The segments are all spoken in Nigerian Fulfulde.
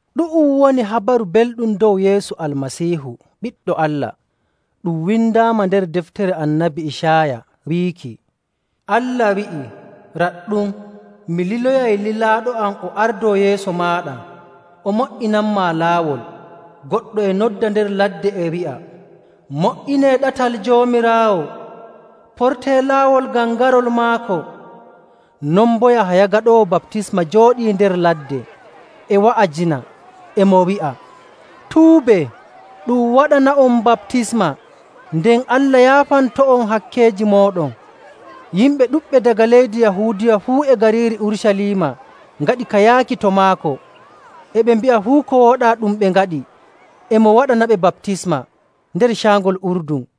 Ɗu'um woni Habaru Belɗum dow Yeesu Almasiihu, Ɓiɗɗo Allah. Ɗum windaama nder deftere Annabi Icaaya wiiki, “Allah wi'i, ‘Raɗɗum, mi liloyay lilaaɗo am o ardoo yeeso maaɗa o mo''inanmaa laawol.’. Goɗɗo e nodda nder ladde, e wi'a, ‘Mo''inee ɗatal Joomiraawo, portee laawol ngam garol maako.’”. Non boo Yahaya Gaɗoowo Baptisma jooɗii nder ladde, e wa'ajina, e mo wi'a, “Tuubee, ɗum waɗana'on baptisma, nden Allah yaafanto'on hakkeeji mooɗon.” Yimɓe ɗuɗɓe daga leydi Yahuudiya fuu e gariiri Urucaliima ngaɗi ka yaaki to maako. E ɓe mbi'a fuu ko wooɗaa ɗum ɓe ngaɗi, e mo waɗanaɓe baptisma nder Caangol Urdun.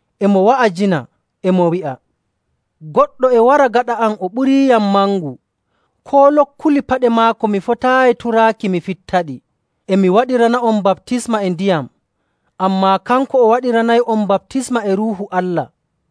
E mo wa'ajina, e mo wi'a, “Goɗɗo e wara gaɗa am o ɓuriiyam mangu, koo lokkulli paɗe maako mi fotaayi turaaki mi fittaɗi. E mi waɗirana'on baptisma e ndiyam, ammaa kanko o waɗiranay'on baptisma e Ruuhu Allah.”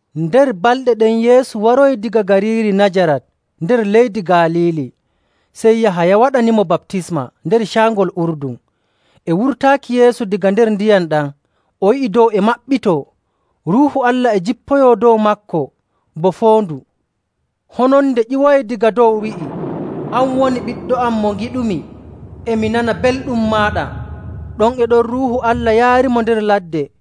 Nder balɗe ɗen Yeesu waroyi daga gariiri Najarat nder leydi Galiili, sey Yahaya waɗanimo baptisma nder Caangol Urdun. E wurtaaki Yeesu daga nder ndiyam ɗam, o yi'i dow e maɓɓitoo, Ruuhu Allah e jippoyoo dow maako bo foondu. Hononde ƴiwoyi daga dow wi'i, “An woni Ɓiɗɗo am, mo ngiɗumi. E mi nana belɗum maaɗa.”. Ɗon e ɗon Ruuhu Allah yaarimo nder ladde.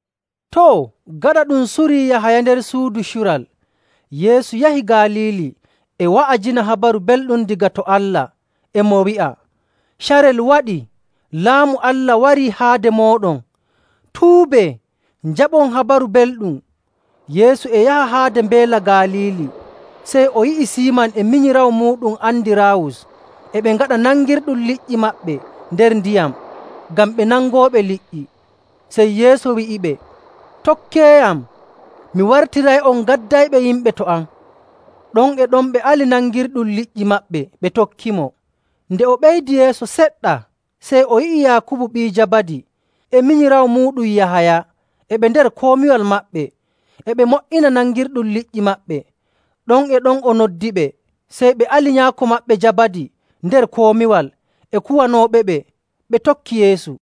Too, gaɗa ɗum surii Yahaya nder suudu cural, Yeesu yahi Galiili e wa'ajina Habaru Belɗum daga to Allah. E mo wi'a, “Carel waɗii! Laamu Allah warii haade mooɗon. Tuubee, njaɓon Habaru Belɗum.”. Yeesu e yaha haade Mbeela Galiili, sey o yi'i Siiman e minyiraawo muuɗum Andiraawus e ɓe ngaɗa nangirɗum liƴƴi maɓɓe nder ndiyam, ngam ɓe nangooɓe liƴƴi. Sey Yeesu wi'iɓe, “Tokkeeyam, mi wartiray'on gaddayɓe yimɓe to am.” Ɗon e ɗon ɓe ali nangirɗum liƴƴi maɓɓe ɓe tokkimo. Nde o ɓeydi yeeso seɗɗa, sey o yi'i Yaakubu ɓii Jabadi e minyiraawo muuɗum Yahaya e ɓe nder komiwal maɓɓe, e ɓe mo''ina nangirɗum liƴƴi maɓɓe. Ɗon e ɗon o noddiɓe. Sey ɓe ali nyaako maɓɓe Jabadi nder komiwal e kuwanooɓeɓe, ɓe tokki Yeesu.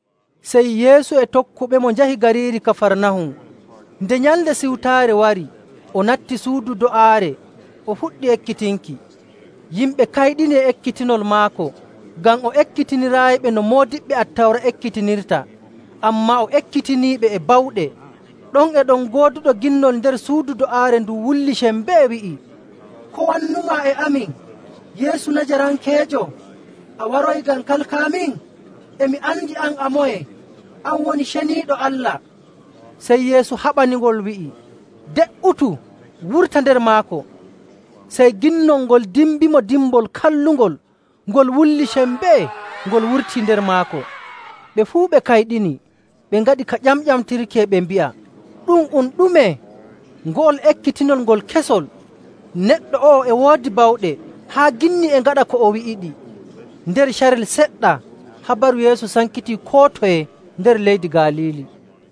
Sey Yeesu e tokkuɓemo njahi gariiri Kafarnahum. Nde Nyalnde Siwtaare wari, o natti suudu do'aare, o fuɗɗi ekkitinki. Yimɓe kayɗini e ekkitinol maako, ngam o ekkitiniraayiɓe no moodiɓɓe Attawra ekkitinirta, ammaa o ekkitiniiɓe e bawɗe.. Ɗon e ɗon gooduɗo ginnol nder suudu do'aare ndun wulli sembee, wi'i, “Ko wannumaa e amin, Yeesu Najarankeejo? A waroyi ngam kalkaamin? E mi andi an a moye. An woni Ceniiɗo Allah.” Sey Yeesu haɓaningol, wi'i, “De''utu! Wurta nder maako.” Sey ginnol ngol dimbimo dimbol kallungol, ngol wulli sembee, ngol wurtii nder maako. Ɓe fuu ɓe kayɗini, ɓe ngaɗi ka ƴamƴamtirki, e ɓe mbi'a, “Ɗum um ɗume? Ngo'ol ekkitinol ngol kesol! Neɗɗo o'o e woodi bawɗe haa ginni e ngaɗa ko o wi'iɗi.” Nder carel seɗɗa habaru Yeesu sankitii koo toye nder leydi Galiili.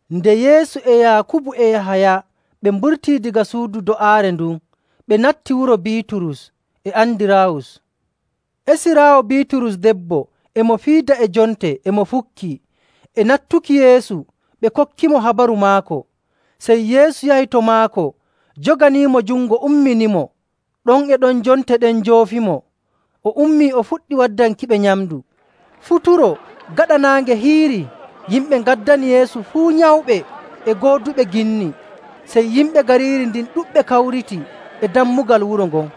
Nde Yeesu e Yaakubu e Yahaya ɓe mburtii daga suudu do'aare ndun, ɓe natti wuro Biiturus e Andiraawus. Esiraawo Biiturus debbo e mo fiida e jonte e mo fukkii. E nattuki Yeesu ɓe kokkimo habaru maako. Sey Yeesu yahi to maako joganiimo jungo umminimo. Ɗon e ɗon jonte ɗen njoofimo, o ummii o fuɗɗi waddankiɓe nyamndu. Futuro, gaɗa naange hiirii, yimɓe ngaddani Yeesu fuu nyawɓe e gooduɓe ginni. Sey yimɓe gariiri ndin ɗuɗɓe kawriti e dammugal wuro ngon.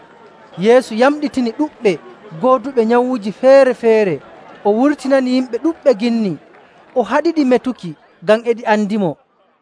Yeesu yamɗitini ɗuɗɓe gooduɓe nyawuuji feere‑feere. O wurtinani yimɓe ɗuɗɓe ginni, o haɗiɗi metuki ngam e ɗi andimo.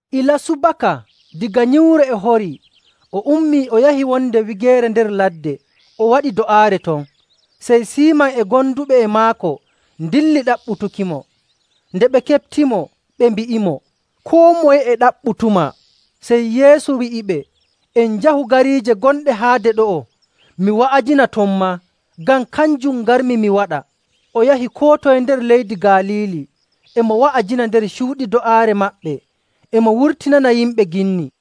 Ilaa subaka, daga nyiwre e horii, o ummii o yahi wonde wigeere nder ladde, o waɗi do'aare ton. Sey Siiman e gonduɓe e maako ndilli ɗaɓɓutukimo. Nde ɓe keɓtimo, ɓe mbi'imo, “Koo moye e ɗaɓɓutumaa!” Sey Yeesu wi'iɓe, “En njahu gariije gonɗe haade ɗo'o mi wa'ajina ton maa, ngam kanjum ngarmi mi waɗa.” O yahi koo toye nder leydi Galiili, e mo wa'ajina nder cuuɗi do'aare maɓɓe, e mo wurtinana yimɓe ginni..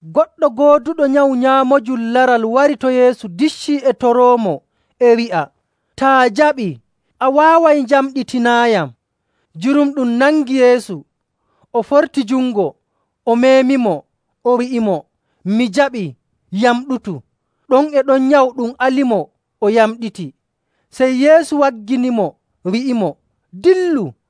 Goɗɗo gooduɗo nyawu nyaamoojum laral wari to Yeesu diccii e toroomo, e wi'a, “Taa jaɓii, a waaway njamɗitinaayam.” Jurumɗum nangi Yeesu, o forti jungo, o meemimo, o wi'imo, “Mi jaɓii. Yamɗutu!” Ɗon e ɗon nyawu ɗum alimo, o yamɗiti. Sey Yeesu wagginimo, wi'imo, “Dillu,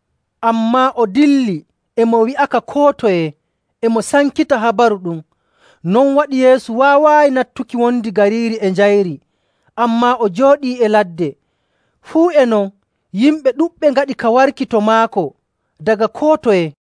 Ammaa o dilli e mo wi'aka koo toye, e mo sankita habaru ɗum. Non waɗi Yeesu waawaayi nattuki wondi gariiri e njayri, ammaa o jooɗii e ladde. Fuu e non, yimɓe ɗuɗɓe ngaɗi ka warki to maako daga koo toye.